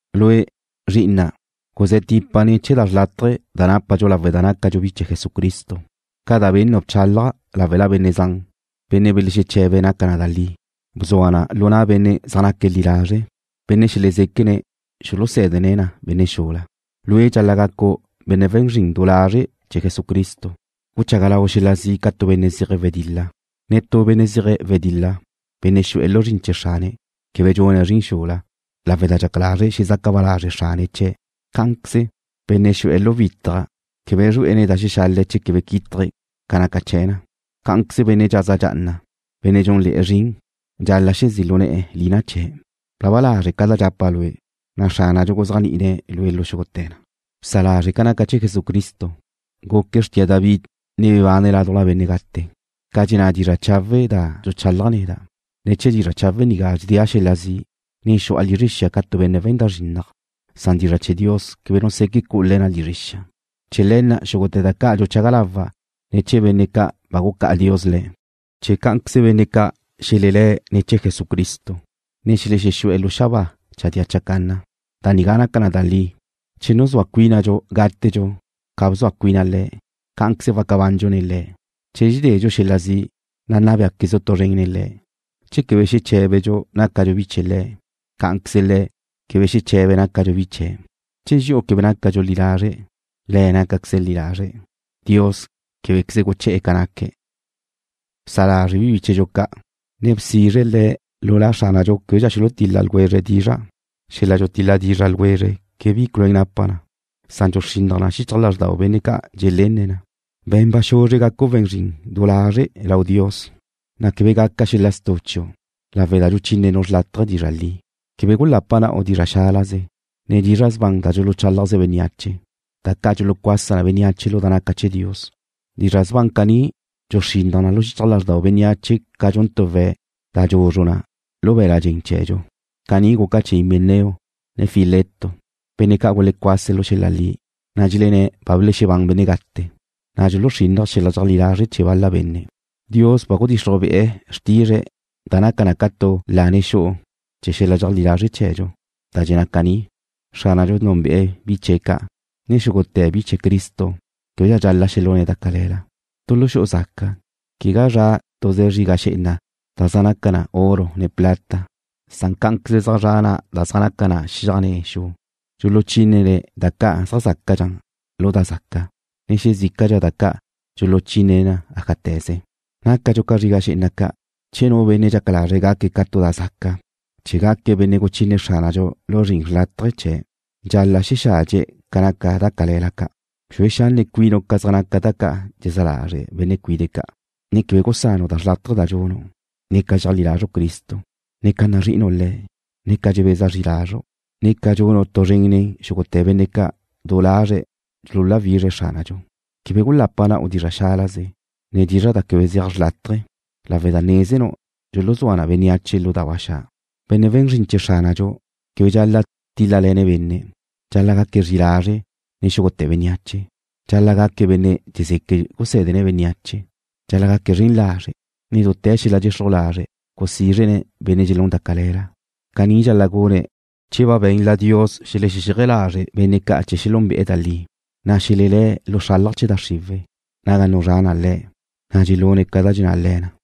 Lue', zri'ina', guzé̱ tipa ne̱ chee̱ da xrlátaje da nápadxu lawe' da nácadxu bi chee̱ Jesucristo. Ca da bennu' bchálaja' láwela benne' zan, benne' belexeche̱be̱' naca na da li, bzua na lu na' benne' zaj naque̱' li lazre', benne' xelezéquene̱' xulusé̱dene̱' na benne' xula. Lue' dxal-la' gacu' benne' we̱n zrin du lazre' chee̱ Jesucristo, guchaga lau' xel-la zi' ca tu benne' zeje̱' wedil-la. Netú benne' zeje̱' wedil-la, benne' xu'e̱ lu zrin chee̱ xrane̱', quebe dxune̱' zrin xula, lawe' da dxaca lazre̱' xezaca ba lazre' xrane̱' chie̱'. Cá'anqueze, benne' xu'e̱ lu witaj quebe zrue'ene̱' da xexale̱' che quebe quítaje̱' ca naca chee̱ na. Cá'anqueze benne' dxaza dxa'ana, benne' dxúnle̱'e̱ zrin, dxal-la' xezí' lu ne̱'e̱ lina chee̱'. Blaba lazre' ca da dxapa' lue', na' Xránadxu guzéajni'ine̱' lue' xúgute̱ na. Bsa lazre' ca naca chee̱ Jesucristo, guque̱' xrtia David, ne bebane̱' ládujla benne' gate, ca dxenná dizra' chawe' da dxuchálaja' neda'. Ne̱ chee̱ dizra' chawe' nigá dxedéa' xel-la zi', ne xu'a lizre xia nigá ca tu benne' we̱n da zrinnaj, san dizra' chee̱ Dios quebe nu seque' cu'u le̱ na lizre xia. Chee̱ le̱ na' xúgute̱ da ca' dxuchaga lawa' ne̱ chee̱ benne' ca' ba gucá'a Dios le̱', chee̱ cá'anqueze benne' ca' xelelé̱' ne̱ chee̱ Jesucristo, ne xelexexú'e̱ lu xabáa chadía chacanna. Da nigá naca na da li: Che nuzúa cuínadxu gátedxu ca bzua cuina Le̱', cá'anqueze waca bandxu nen Le̱'. Che dxededxu xel-la zi', na' nna béaquezdxu tu zren nen Le̱'. Che quebe xeché̱bedxu nácadxu bi chee̱ Le̱', cá'anqueze Le̱' quebe xeche̱be̱' nácadxu bi chee̱'. Che dxi'u quebe nácadxu li lazre', Le̱' nácaqueze̱' li lazre'. Dios québequeze guché̱'e̱ ca naque̱'. Bsa lazre' bi bíchedxu ca', ne bsizre le̱' lu La Xránadxu québedxa xulutil-la dizra' ljwezre̱'. Xel-la dxutil-la dizra ljwezre quebe bi culuén napa na, san dxuxrinnaj na xichaj lázrdau benne' ca' dxelénne̱' na. Be̱n ba xuzre gacu' we̱n zrin du lazre' lau Dios, na' quebe gaca xel-la stu' chiu', lawe' da dxuchínenu' xrlátaje dizra' li. Quebe gulapa na'u dizra' xálaze, ne dizra' sban da dxuluchálajze bénneache, da ca' dxulucuasa na bénneache lu da naca chee̱ Dios. Dizra' sban caní dxuluxrinnaj na xichaj lázrdau bénneache ca dxun tu we̱' da dxuzru na lu be̱l-la' dxen chee̱dxu. Caní guca chee̱ Himeneo, ne Fileto, benne' ca' gulecuase̱' lu xel-la li, na' dxelenné̱' ba belexebán benne' gate, na' dxuluxrínnaje̱' xel-la dxeajlí lazre' chee̱ bal-la benne'. Dios ba gudixruj bi'e̱ xrtizre̱' da naca na ca tu lane xu'u chee̱ xel-la dxeajlí lazre' chee̱dxu, da dxenná caní: Xránadxu núnbe'e̱ bi chie̱' ca' Cá'anqueze dxenná na: Xúgute̱ bi ca' chee̱ Cristo québedxa dxal-la' xelune̱' da cale̱la. Tu lu xu'u zaca, quegá zra' tuze zriga xé'ena da zaj naca na oro ne plata, san cá'anqueze zaj zra' da zaj naca na xiaj ne xu. Dxuluchínene̱' da ca' zaj zácadxa lu da zaca, na' xezícadxa da ca' dxuluchínene̱' ájate̱ze. Nácadxu ca zriga xé'ena ca'. Che nu benne' dxaca lazre̱' gaque̱' ca tu da zaca, chee̱ gaque̱' benne' guchine Xránadxu lu zrin xrlátaje chee̱', dxal-la' xexadxe̱' ca naca da cale̱la ca'. Bxue xanne' cuinu' ca zaj naca da ca' dxelezá lazre' benne' cuide' ca', ne quebe gusanu' da xrlátaje da dxunu', ne ca dxeajlí lazru' Cristo, ne ca nazri'inu' Le̱', ne ca dxebeza zri lazru', da ca' dxunu' tu zren nen xúgute̱ benne' ca' du lazre̱' dxululáwizre̱' Xránadxu. Quebe gulapa na'u dizra' xálaze, ne dizra' quebe zeaj xrlátaje, lawe' da nézenu' dxuluzúa na bénneache lu da ba xa'. Benne' we̱n zrin chee̱ Xránadxu: Quebe dxal-la' tíl-lale̱ne̱' benne'. Dxal-la' gaque̱' zri'i lazre' nen xúgute̱ bénneache. Dxal-la' gaque̱' benne' dxezeque̱' gusé̱dene̱' bénneache. Dxal-la' gaque̱' zren lazre', ne dute̱ xel-la dxexruj lazre' gusízrene̱' benne' dxelune̱' da cale̱la. Caní dxal-la' gune̱' che ba benla Dios xelexexéaje lazre̱' benne' ca chee̱ xelúnbe'e̱ da li, na' xelelé̱' lu xralaj chee̱ da xriwe̱', naga nuzrá na le̱', na' dxelune̱' ca da dxenná le̱ na.